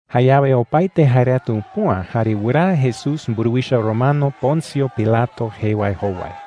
Jayawe opaete jae reta upüa jare wɨraa Jesús mburuwicha romano Poncio Pilato jee wae jowai.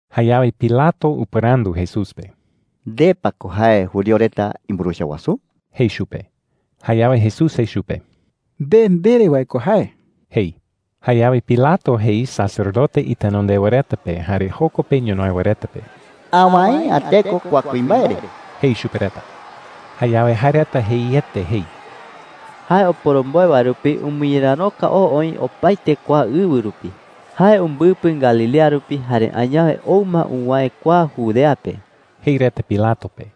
Jayawe Pilato upɨrandu Jesús pe: “¿Nde pa ko jae judío reta imburuwicha wasu?” jei chupe. Jayawe Jesús jei chupe: “Nde ndere wae ko jae,” jei. Jayawe Pilato jei sacerdote itenondewa reta pe jare joko pe ñonoï wae reta pe: “Awäe’ä teko kua kuimbae re,” jei chupe reta. Jayawe jae reta jeiete jei: “Jae oporomboe wae rupi umɨñeräroka oo oï opaete kua ɨwɨ rupi. Jae umbɨpɨ Galilea rupi jare añawe ou ma uwäe kua Judea pe,” jei reta Pilato pe.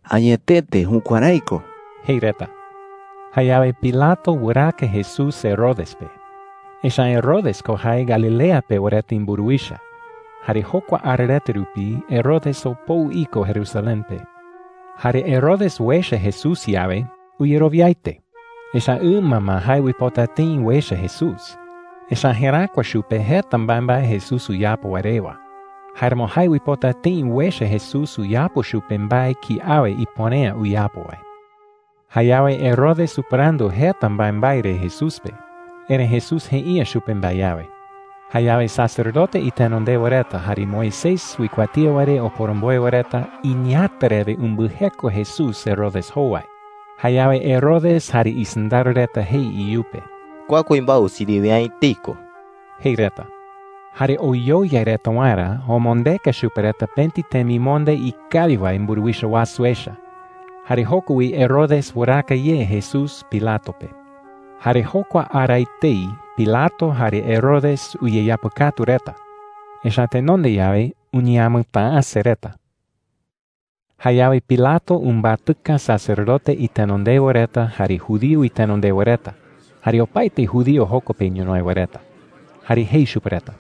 “Añetete jukuärái ko,” jei reta. Jayawe Pilato wɨraaka Jesús Herodes pe. Echa’ä Herodes ko jae Galilea pewa reta imburuwicha. Jare jokua ara reta rupi Herodes opou iko Jerusalén pe. Jare Herodes uecha Jesús yawe, uyerowiaete, echa’ä ɨma ma jae uipota tëi uecha Jesús. Echa’ä jeräkua chupe jeta mbaembae Jesús uyapo wae rewa. Jáeramo jae uipota tëi uecha Jesús uyapo chupe mbae kiawe ipuere’ä uyapo wae. Jayawe Herodes upɨrandu jeta mbaembae re Jesús pe, erëi Jesús jei’ä chupe mbae awe. Jayawe sacerdote itenondewa reta jare Moisés uikuatía wae re oporomboe wae reta iñeeäta rewe umbɨjeko Jesús Herodes jowai. Jayawe Herodes jare isɨndaro reta jei iyupe: “Kua kuimbae usiriwe’ä etei ko,” jei reta. Jare oyoyai reta waerä, omondeka chupe reta pëti temimonde ikawi wae mburuwicha wasu echa. Jare joko wi Herodes wɨraaka ye Jesús Pilato pe. Jare jokua ara etei Pilato jare Herodes uyeapɨkatu reta. Echa’ä tenonde yawe uñeamɨtäase reta. Jayawe Pilato umbatɨka sacerdote itenondewa reta, jare judío itenondewa reta, jare opaete judío joko pe ñonoï wae reta. Jare jei chupe reta: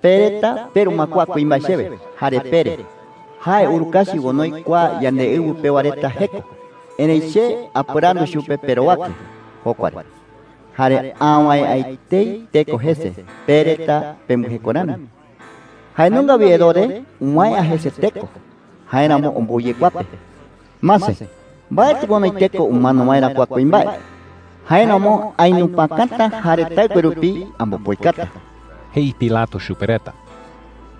“Pe reta peru ma kua kuimbae chewe jare pere, ‘Jae urukachi onoi kua yandeɨwɨ pewa reta jeko.’ Erëi che apɨrandu chupe perowake jokua re, jare awäe’ä etei teko jese pe reta pembɨjeko rami,” jei. “Jae nunga wi Herodes uwäe’ä jese teko; jáeramo ombou ye kua pe,” jei. “Mase, mbaetɨ onoi teko umano waerä kua kuimbae. Jáeramo ainupakata, jare taɨkue rupi ambopoikata,” jei Pilato chupe reta.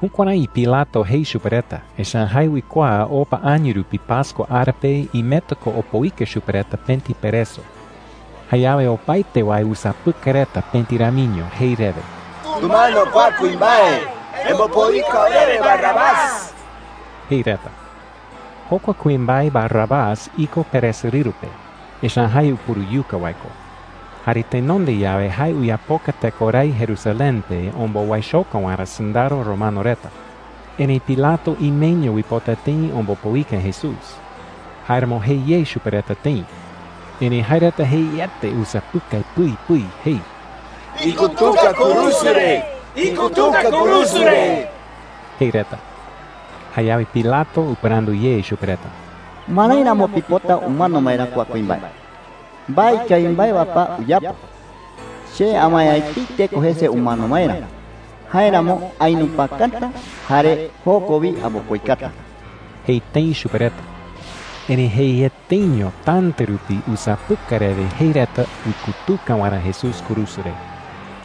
Jukuärái Pilato jei chupe reta, echa’ä jae uikuaa opa año rupi pascua ara pe imeta ko opoika chupe reta pëti pereso. Jayawe opaete wae usapɨkai reta pëti ramiño jei rewe: “¡Tumano kua kuimbae! ¡Embopoika orewe Barrabás!” jei reta. Jokua kuimbae Barrabás iko peresorɨru pe, echa’ä jae upuruyuka wae ko. Jare tenonde yawe jae uyapoka tekorái Jerusalén pe ombowaichoka waerä sɨndaro romano reta. Erëi Pilato imeño uipota tëi ombopoika Jesús. Jáeramo jei ye chupe reta tëi. Erëi jae reta jeiete usapɨkai pɨi pɨi jei: “¡Ikutuka kurusu re! ¡Ikutuka kurusu re!” jei reta. Jayawe Pilato upɨrandu ye chupe reta: “¿Marái ramo pipota umano waerä kua kuimbae? ¿Mbae ikawi mbae wae pa uyapo? Che awäe’ä etei teko jese umano waerä. Jáeramo ainupakata, jare joko wi ambopoikata,” jei tëi chupe reta. Erëi jeieteño täta rupi usapɨkai rewe jei reta uikutuka waerä Jesús kurusu re.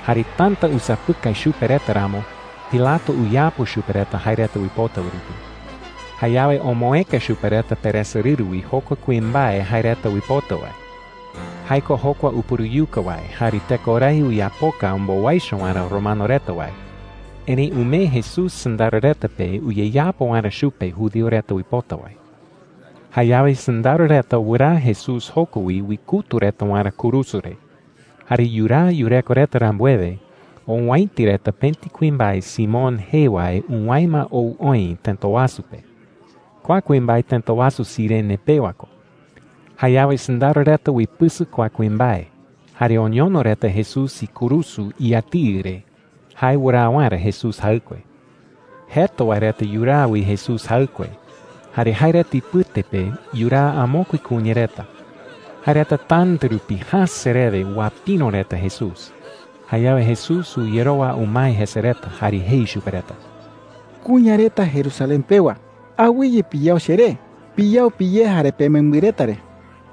Jare täta usapɨkai chupe reta ramo, Pilato uyapo chupe reta jae reta uipota wae rupi. Jayawe omoëka chupe reta peresorɨru wi jokua kuimbae jae reta uipota wae – jae ko jokua upuruyuka wae jare tekorái uyapoka ombowaicho waerä romano reta wae. Erëi umee Jesús sɨndaro reta pe uyeyapo waerä chupe judío reta uipota wae. Jayawe sɨndaro reta wɨraa Jesús joko wi uikutu reta waerä kurusu re. Jare yuraa yureko reta rambuewe, owäiti reta pëti kuimbae Simón jee wae uwäe ma ou oï tëta wasu pe. Kua kuimbae tëta wasu Cirene pewa ko. Jayawe sɨndaro reta uipɨsɨ kua kuimbae jare oñono reta Jesús ikurusu iyatiɨ re jae wɨraa waerä Jesús jaɨkue. Jeta wae reta yuraa wi Jesús jaɨkue. Jare jae reta ipɨte pe yuraa amokue kuña reta. Jae reta täta rupi jäse rewe uapïro reta Jesús. Jayawe Jesús uyerowa umae jese reta, jare jei chupe reta: “Kuña reta Jerusalén pewa, awɨye piyao cheré. Piyao piyé jare pemembɨ reta re.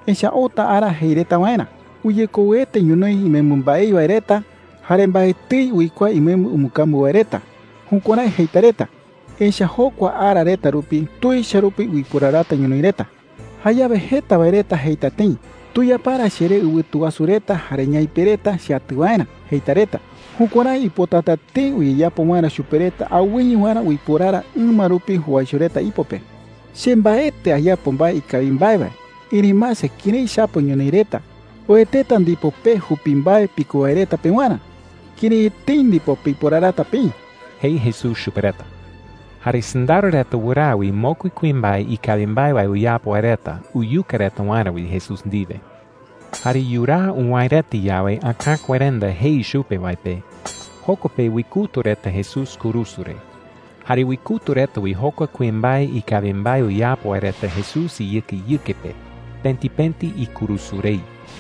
Echa’ä outa ara jei reta waerä: ‘Uyekouete ñonoï imembɨ mbaei wae reta jare mbaetɨi uikuaa imembɨ umbɨkambu wae reta.’ Jukuärái jeita reta, echa’ä jokua ara reta rupi tuicha rupi uiporarata ñonoï reta,” jei. “Jayawe jeta wae reta jeita tëi: ‘Tuyapara cheré ɨwɨtu wasu reta jare ñaipe reta cheatɨ waerä,’ jeita reta. Jukuärái uipotata tëi uyeyapo waerä chupe reta awɨye waerä uiporara ɨma rupi jowaicho reta ipo pe,” jei chupe reta. “Che mbaetɨ ayapo mbae ikawi mbae wae, erëi mase kërái chapo ñonoï reta. Oeteta ndipo pe jupi mbae piko wae reta pewarä. ¡Kërái etei ndipo piporarata peï!” jei Jesús chupe reta. Jare sɨndaro reta wɨraa wi mokui kuimbae ikawi mbae wae uyapo wae reta uyuka reta waerä wi Jesús ndiwe. Jare yuraa uwäe reta yawe Äkakuerenda jei chupe wae pe, joko pe uikutu reta Jesús kurusu re. Jare uikutu reta wi jokua kuimbae ikawi mbae uyapo wae reta Jesús iyɨkeyɨke pe, pëti pëti ikurusu rei.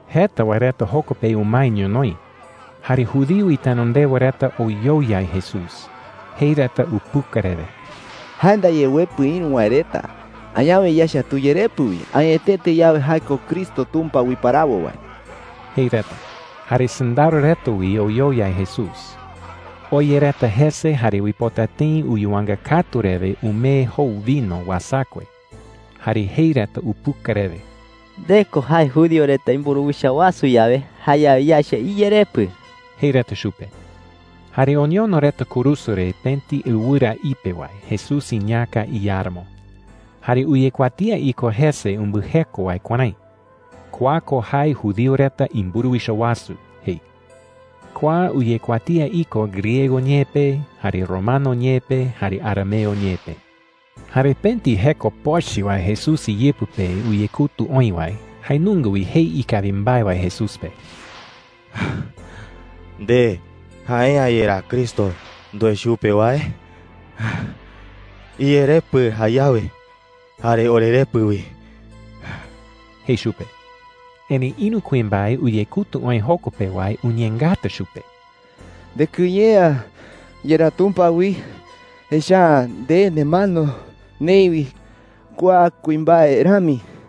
Jeta wae reta joko pe umae ñonoï. Jare judío itenondewa reta oyoyai Jesús. Jei reta upuka rewe: “Jae ndaye uepɨ ïru wae reta. Añawe yaecha tuyerepɨ wi, añetete yawe jae ko Cristo Tumpa uiparawo wae,” jei reta. Jare sɨndaro reta wi oyoyai Jesús. Oya reta jese jare uipota tëi uyuwanga katu rewe umee jou vino uasakue. Jare jei reta upuka rewe: “Nde ko jae judío reta imburuwicha wasu yawe, jayawe yaecha iyerepɨ,” jei reta chupe. Jare oñono reta kurusu re pëti ɨwɨra ipe wae Jesús iñäka iáramo. Jare uyekuatía iko jese umbɨjeko wae kuärái: “KUA KO JAE JUDÍO RETA IMBURUWICHA WASU,” jei. Kua uyekuatía iko griego ñee pe, jare romano ñee pe, jare arameo ñee pe. Jare pëti jeko pochɨ wae Jesús iyɨpɨ pe uyekutu oï wae, jae nunga wi jei ikawi mbae wae Jesús pe. “¿Nde jae’ä yerá Cristo ndoe chupe wae? Iyerepɨ jayawe, jare orerepɨ wi,” jei chupe. Erëi ïru kuimbae uyekutu oï joko pe wae uñeengata chupe. “¿Ndekɨye’ä yerá Tumpa wi? Echa’ä nde nemano neï wi kua kuimbae rami,” jei chupe.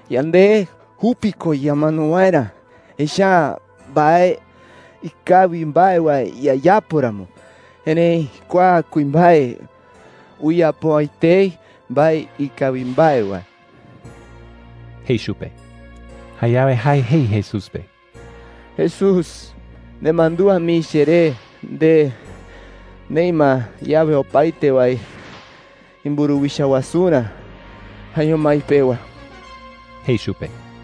“Yande jupi ko ñamano waerä, echa’ä mbae ikawi mbae wae yayapo ramo. Erëi kua kuimbae uyapo’ä etei mbae ikawi mbae wae,” jei chupe. Jayawe jae jei Jesús pe: “Jesús, nemandúa mii cheré nde neï ma yawe opaete wae imburuwicha wasurä jaeño mái pewa,” jei chupe.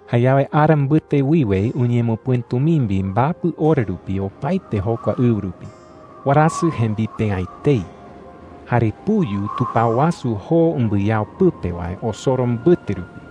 Jayawe ara mbɨte wiwe uñemɨpɨ̈tumimbi mbapɨ ora rupi opaete jokua ɨwɨ rupi. Warasɨ jembipe’ä etei. Jare puyu tupao wasu joo umbɨyao pɨpe wae osoro mbɨte rupi.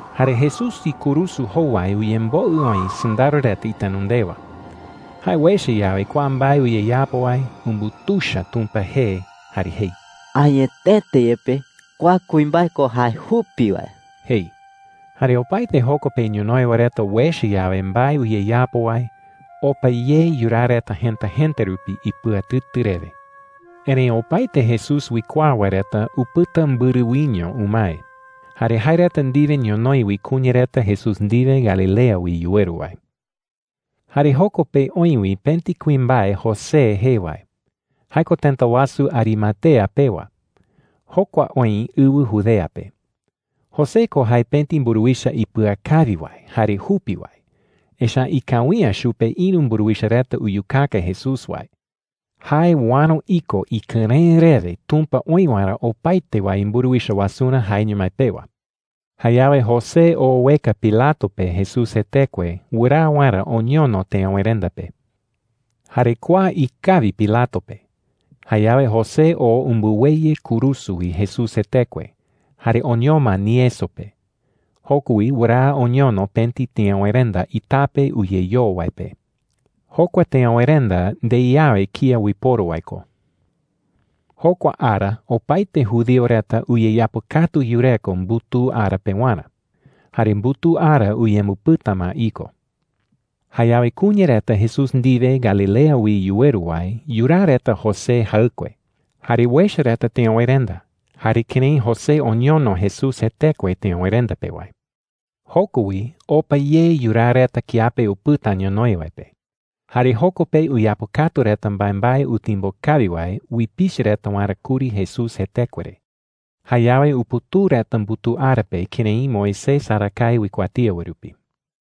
Jare Jesús ikurusu jowai uyemboɨ oï sɨndaro reta itenondewa. Jae uecha yawe kua mbae uyeyapo wae, umbutuicha Tumpa jee jare jei: “Añetete yepe, kua kuimbae ko jae jupi wae,” jei. Jare opaete joko pe ñonoï wae reta uecha yawe mbae uyeyapo wae, opa ye yuraa reta jëta jëta rupi ipɨatɨtɨ rewe. Erëi opaete Jesús uikuaa wae reta upɨta mbɨrɨ wiño umae. Jare jae reta ndiwe ñonoï wi kuña reta Jesús ndiwe Galilea wi yuweru wae. Jare joko pe oï wi pëti kuimbae José jee wae. Jae ko tëta wasu Arimatea pewa. Jokua oï ɨwɨ Judea pe. José ko jae pëti mburuwicha ipɨakawi wae jare jupi wae. Echa’ä ikawi’ä chupe ïru mburuwicha reta uyukaka Jesús wae. Jae uäro iko ikɨrëɨ rewe Tumpa oï waerä opaete wae imburuwicha wasurä jaeño mái pewa. Jayawe José oo ueka Pilato pe Jesús jetekue wɨraa waerä oñono teöwerenda pe. Jare kua ikawi Pilato pe. Jayawe José oo umbɨweyɨ kurusu wi Jesús jetekue, jare oñoma nieso pe. Joko wi wɨraa oñono pëti teöwerenda itape uyeyoo wae pe. Jokua teöwerenda ndei awe kía uiporu wae ko. Jokua ara opaete judío reta uyeyapɨkatu yureko mbutuu ara pewarä. Jare mbutuu ara uyembɨpɨta ma iko. Jayawe kuña reta Jesús ndiwe Galilea wi yuweru wae yuraa reta José jaɨkue. Jare uecha reta teöwerenda jare kërái José oñono Jesús jetekue teöwerenda pe wae. Joko wi opa ye yuraa reta kiape upɨta ñonoï wae pe. Jare joko pe uyapɨkatu reta mbaembae utimbo kawi wae uipichɨ reta waerä kuri Jesús jetekue re. Jayawe uputuu reta mbutuu ara pe kërái Moisés arakae uikuatía wae rupi.